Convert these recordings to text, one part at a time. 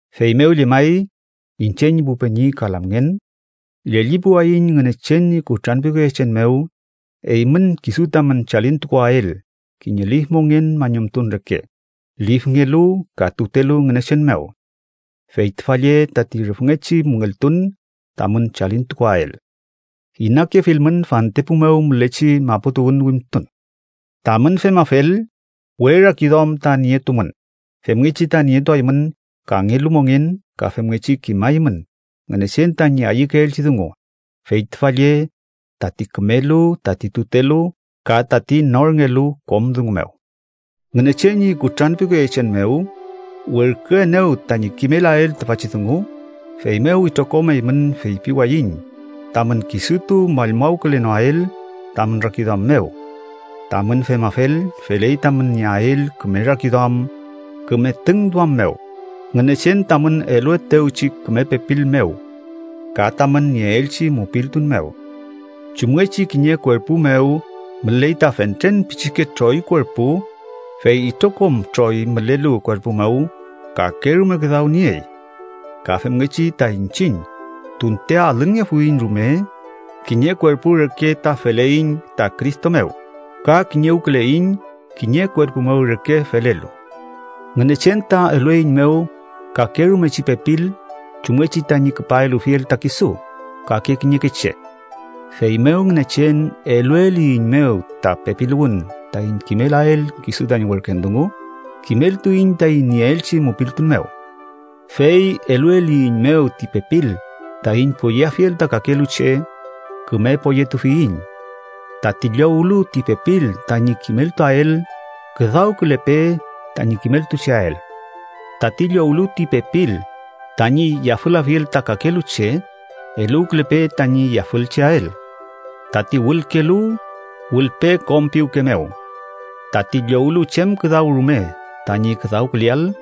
Feymew llemay, iñche ñi pu peñi ka lamngen, llellipuwayiñ Ngünechen ñi kutranpiwkeyechen mew eymün kisu tamün chalintukuwael kiñe lif mongen mañumtun reke, lifngelu ka tutelu Ngünechen mew. Fey tüfa lle tati rüfngechi müngeltun tamün chalintukuael. Inakefilmün fantepu mew mülechi maputuwün wimtun. Tamün femafel, we rakiduam ta nietumün femngechi ta nietuaymün kangelu mongen ka femngechi kimaymün Ngünechen tañi ayükeelchi dungu, fey tüfa lle tati kümelu, tati tutelu, ka tati norngelu kom dungu mew. Ngünechen ñi kutranpiwkeyechen mew werküenew tañi kimelael tüfachi dungu, feymew itrokom eymün feypiwayiñ tamün kisutu mallmawkülenoael tamün rakiduam mew. Tamün femafel, feley tamün nieael küme rakiduam küme tüngduam mew, Ngünechen tamün eluetewchi küme pepil mew ka tamün nieelchi mupiltun mew. Chumngechi kiñe kuerpu mew müley ta fentren pichike troy kuerpu, fey itrokom troy mülelu kuerpu mew kakerume küdaw niey. Ka femngechi ta iñchiñ, tunte alünngefuiñ rume, kiñe kuerpu reke ta feleiñ ta Cristo mew ka kiñewküleiñ kiñe kuerpu mew reke felelu. Ngünechen ta elueiñmew kakerumechi pepil chumngechi tañi küpa elufiel ta kisu kake kiñeke che. Feymew, Ngünechen elueliyiñmew ta pepiluwün taiñ kimelael kisu tañi werken dungu, kimeltuiñ taiñ nieelchi mupiltun mew. Fey elueliyiñmew ti pepil taiñ poyeafiel ta kakelu che, küme poyetufiyiñ. Tati llowlu ti pepil tañi kimeltuael, küdawkülepe tañi kimeltucheael. Tati llowlu ti pepil tañi yafülafiel ta kakelu che, eluwkülepe tañi yafülcheael. Tati wülkelu, wülpe kom piwke mew. Tati llowlu chem küdaw rume tañi küdawküleael,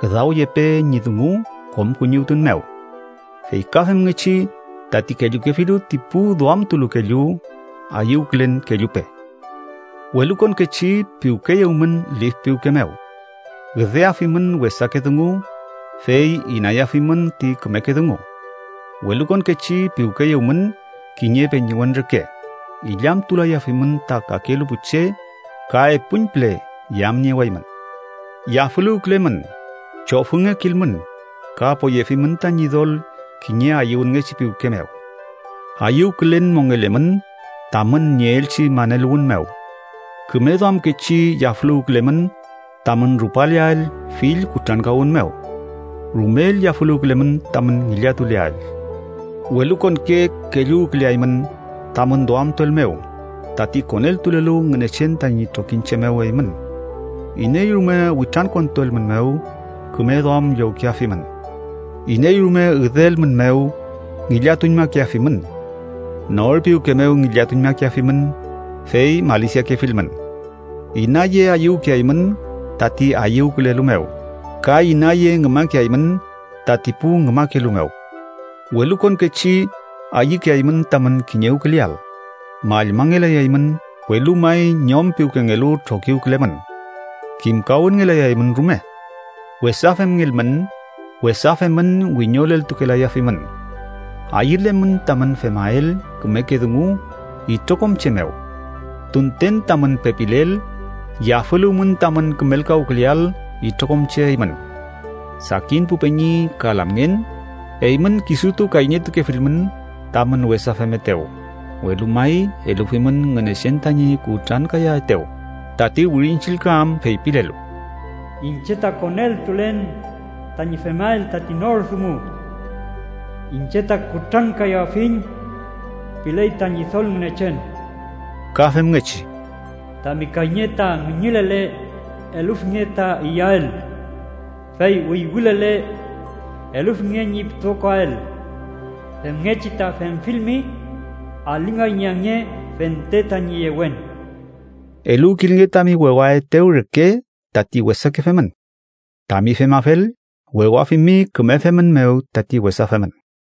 küdawyepe ñi dungu kom kuñiwtun mew. Fey ka femngechi tati kellukefilu ti pu duamtulu kellu, ayüwkülen kellupe. Welukonkechi piwkeyewmün lif piwke mew. Üdeafimün wesake dungu fey inayafimün ti kümeke dungu. Welukonkechi piwkeyewmün kiñe peñiwen reke, illamtulayafimün ta kakelu pu che ka epuñpüle yamniewaymün. Yafüluwkülemün, chofüngekilmün ka poyefimün ta Ñidol kiñe ayüwünngechi piwke mew. Ayüwkülen mongelemün tamün nieelchi maneluwün mew. Küme duamkechi yafüluwkülemün tamün rupaleael fill kutrankawün mew. Rumel yafüluwkülemün tamün ngillatuleael. Welukonke kelluwküleaymün tamün duamtuel mew tati koneltulelu Ngünechen tañi trokiñche mew eymün. Iney rume witrankontuelmünmew, küme duam llowkeafimün. Iney rume üdeelmünmew, ngillatuñmakeafimün. Nor piwke mew ngillatuñmakeafimün, fey malisiakefilmün. Inaye ayüwkeaymün tati ayüwkülelu mew ka inaye ngümakeaymün tati pu ngümakelu mew. Welukonkechi ayükeaymün tamün kiñewküleael. Mallmangelayaymün, welu may ñom piwkengelu trokiwkülemün. Kimkawünngelayaymün rume. Wesa femngelmün, wesa femün wiñoleltukelayafimün. Ayülemün tamün femael kümeke dungu itrokom che mew. Tunten tamün pepilel, yafüluwmün tamün kümelkawküleael itrokom che eymün. Sakin pu peñi ka lamngen, eymün kisutu kayñetukefilmün tamün wesa femetew, welu may elufimün Ngünechen tañi kutrankayaetew, tati Wirin Chillka am feypilelu: “Iñche ta koneltulen tañi femael tati nor dungu. Iñche ta kutrankayafiñ ―piley ta Ñidol Ngünechen.” Ka femngechi: “Tami kayñe ta ngüñülele, elufinge ta iyael. Fey wüywülele, elufinge ñi pütokoael. Femngechi ta femfilmi alingay ñi ange fente tañi yewen.” Eluwkilnge tami wewaetew reke tati wesake femün. Tami femafel, wewafimi küme femün mew tati wesa femün.